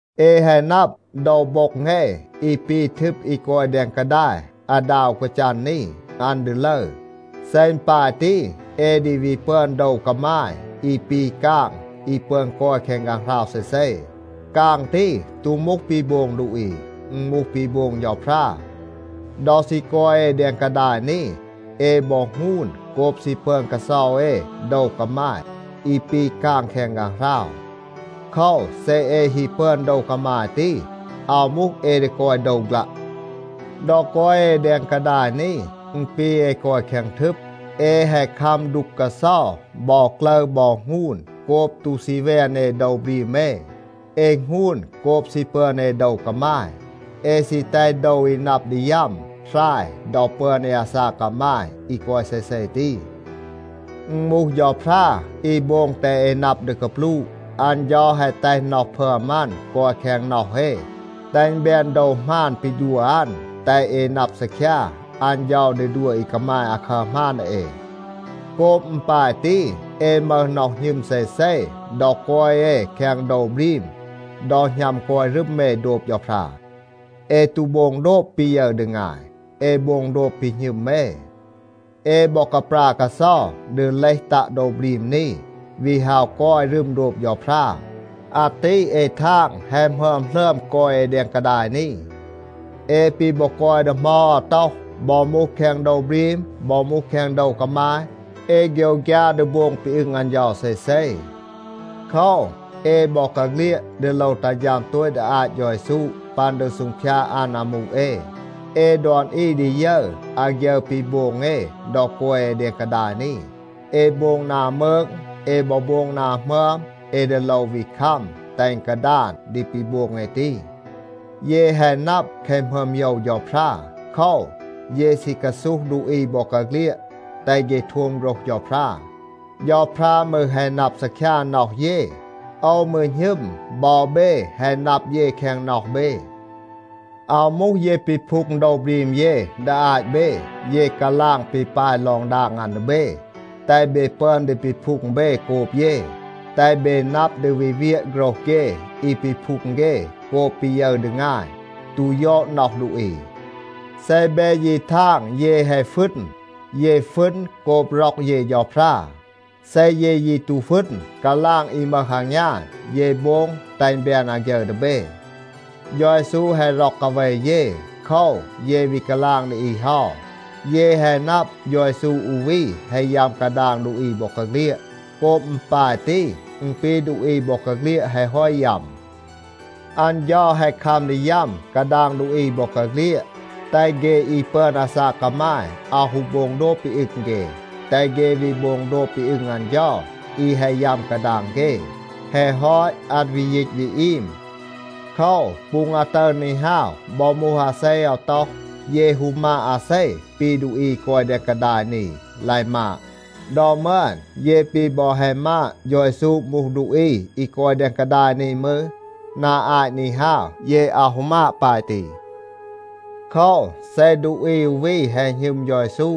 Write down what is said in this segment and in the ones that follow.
เอ แฮะ นับ, โดว โบ็ง เอ อี ปี ทึบ อี กอย แดง กาดาย อาดา อู กาจัน นี, อัน ดี ลึร. เซ อึณ ปาย ตี, เอ ดี วี ปึอน โดว กามาย อี ปี กาง อี ปึอน กอย แคง ฆางหราว เซเซ. กาง ตี ตู มูห ปี โบง ดูอี, อึณ มูห ปี โบง เฌาพรา. ดอ ซี กอย เอ แดง กาดาย นี, เอ บอ หงูน โกบ ซี ปึอน กาเซา เอ โดว กามาย อี ปี กาง แคง ฆางหราว. โคว, เซ เอ ฮี ปึอน โดว กามาย ตี, อาว มูห เอ ดี กอย โดว ฆลัะ. ดอ กอย เอ แดง กาดาย นี, อึณ ปี เอ กอย แคง ทึบ. เอ แฮะ คัม ดูก กาเซา บอ กลึร บอ หงูน โกบ ตู ซี แวน เอ โดว บรีม เอ. เอ หงูน โกบ ซี ปึอน เอ โดว กามาย. เอ ซี แตห โดว อี นับ ดี ยัม หราย ดอ ปึอน เอ อาซาก กามาย อี กอย เซเซ ตี. อึณ มูห เฌาพรา อี โบง แตห เอ นับ ดี กาปลูะ. อัน เฌา แฮะ แตห น็อห พึอม อัน กอย แคง น็อห เอ, แตห อึณ แบน โดว หมาน ปี ดัว อัน, แตห เอ นับ ซีคยา อัน เฌา ดี ดัว อี กามาย อาคัร หมาน ดี เอ. โกบ อึณ ปาย ตี, เอ มึห น็อห หณึม เซเซ ดอ กอย เอ แคง โดว บรีม ดอ หณัม กอย รึม เอ โดบ เฌาพรา. เอ ตู โบง โดบ ปี ยึร ดี งาย. เอ โบง โดบ ปี หณึม เอ. เอ บอ กาปรา กาเซา ดี เลห ตัะ โดว บรีม นี, วี ฮาว กอย รึม โดบ เฌาพรา. อาตี เอ ทาง, แฮะ หมึอม หลึอม กอย เอ แดง กาดาย นี. เอ ปี บอ กอย ดี เหมา อาว ต็อห, บอ มูห แคง โดว บรีม, บอ มูห แคง โดว กามาย, เอ โฆยวฆยา ดี โบง ปี อึง อัน เฌา เซเซ. โคว, เอ บอกาเฆลียด ดี โลว ตัห ฌัม โตต ดี อาต เฌา เยซู ปัน ดี ซูงพยาด อัน อามู เอ. เอ ดอน อี ดี ยึร อาฆยึร ปี โบง เอ ดอ กอย เอ แดง กาดาย นี. เอ โบง นา มืก, เอ บอ โบง นา หมึอม, เอ ดี โลว วี คัม แตห อึณ กาดาน ดี ปี โบง เอ ตี. เย แฮะ นับ แคะ หมึอม โยว เฌาพรา. โคว, เย ซี กาซูห ดูอี บอกาเฆลียด, แตห เฆ โทม โฆรห เฌาพรา. เฌาพรา มืร แฮะ นับ ซีคยา น็อห เย. โอว มืร หณึม, บอ เบ แฮะ นับ เย แคง น็อห เบ. อาว มูห เย ปีพูง โดว บรีม เย ดี อาต เบ. เย กาลาง ปี ปาย ลอง ดาง อัน ดี เบ, แตห เบ ปึอน ดี ปีพูง เบ โกบ เย, แตห เบ นับ ดี วี เวียะ โฆรห เฆ อี ปีพูง เฆ โกบ ปี ยึร ดี งาย, ตู ยอด น็อห ดูอี. เซ เบ ยี ทาง เย แฮะ ฟึณ, เย ฟึณ โกบ ร็อก เย เฌาพรา. เซ เย ยี ตู ฟึณ, กาลาง อี มึห อางยาน, เย โบง แตห อึณ แบน อาฆยึร ดี เบ. เฌา เยซู แฮะ ร็อก กาเว เย. โคว, เย วี กาลาง ดี อี เฮา. เย แฮะ นับ, เฌา เยซู อู วี แฮะ ยัม กาดาง ดูอี บอกาเฆลียด. โกบ อึณ ปาย ตี, อึณ ปี ดูอี บอกาเฆลียด แฮะ ฮอต ยัม. อัน เฌา แฮะ คัม ดี ยัม กาดาง ดูอี บอกาเฆลียด, แตห เฆ อี ปึอน อาซาก กามาย อาว ฮู โบง โดบ ปี อึง เฆ, แตห เฆ วี โบง โดบ ปี อึง อัน เฌา อี แฮะ ยัม กาดาง เฆ. แฮะ ฮอต, อัน วี ยีต วี อีม. โคว, ปูง อาตึร นี ฮาว, บอ มูห อาเซ อาว ต็อห, เย ฮู มาด อาเซ ปี ดูอี อี กอย แดง กาดาย นี ลาย มาด. ดอ มึอน เย ปี บอ แฮะ มาด, เฌา เยซู มูห ดูอี อี กอย แดง กาดาย นี มืร, นา อาต นี ฮาว, เย อาว ฮู มาด ปาย ตี. โคว, เซ ดูอี อู วี แฮะ หณึม เฌา เยซู,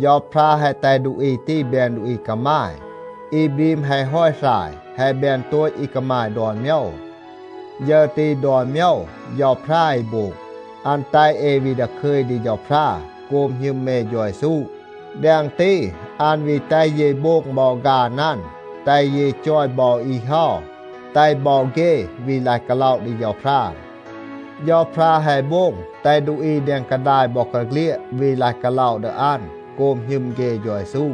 เฌาพรา แฮะ แตห ดูอี ตี แบน ดูอี กามาย. อี บรีม แฮะ ฮอต หราย, แฮะ แบน โตต อี กามาย ดอน โมยว. ฌึร ตี ดอน โมยว เฌาพรา อี โบง. อัน แตห เอ วี ดาคึย ดี เฌาพรา โกบ หณึม เอ เฌา เยซู. แดง ตี, อัน วี แตห เย โบง บอ ฆาน อัน, แตห เย จอย บอ อี เฮา แตห บอ เฆ วี ลาย กาล็อะ ดี เฌาพรา. เฌาพรา แฮะ โบง แตห ดูอี แดง กาดาย บอกาเฆลียด วี ลาย กาล็อะ ดี อัน โกบ หณึม เฆ เฌา เยซู.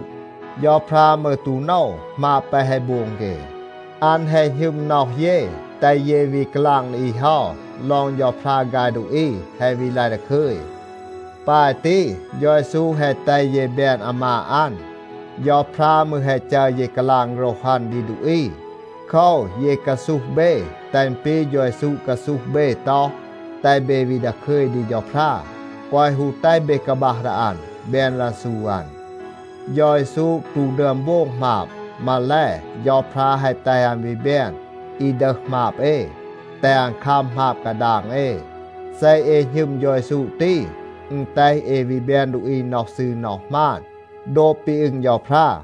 เฌาพรา มืร ตู โนว หมาบ แปะ แฮะ โบง เฆ. อัน แฮะ หณึม น็อห เย, แตห เย วี กาลาง ดี อี เฮา ลอง เฌาพรา ฆาย ดูอี แฮะ วี ลาย ดาคึย. ปาย ตี, เฌา เยซู แฮะ แตห เย แบน อามาด อัน. เฌาพรา มืร แฮะ จัร เย กาลาง โฆรห อัน ดี ดูอี. โคว, เย กาซูห เบ แตห อึณ ปี เฌา เยซู กาซูห เบ ต็อห, แตห เบ วี ดาคึย ดี เฌาพรา, แกวะ ฮู แตห เบ กาบัห ดี อัน, แบน รันซู อัน. เฌา เยซู ตู ดึอม โบง หมาบ. มาแล, เฌาพรา แฮะ แตห อัน วี แบน อี ดึห หมาบ เอ, แตห อัน คัม หมาบ กาดาง เอ. เซ เอ หณึม เฌา เยซู ตี, อึณ แตห เอ วี แบน ดูอี น็อห ซืร น็อห หมาน โดบ ปี อึง เฌาพรา.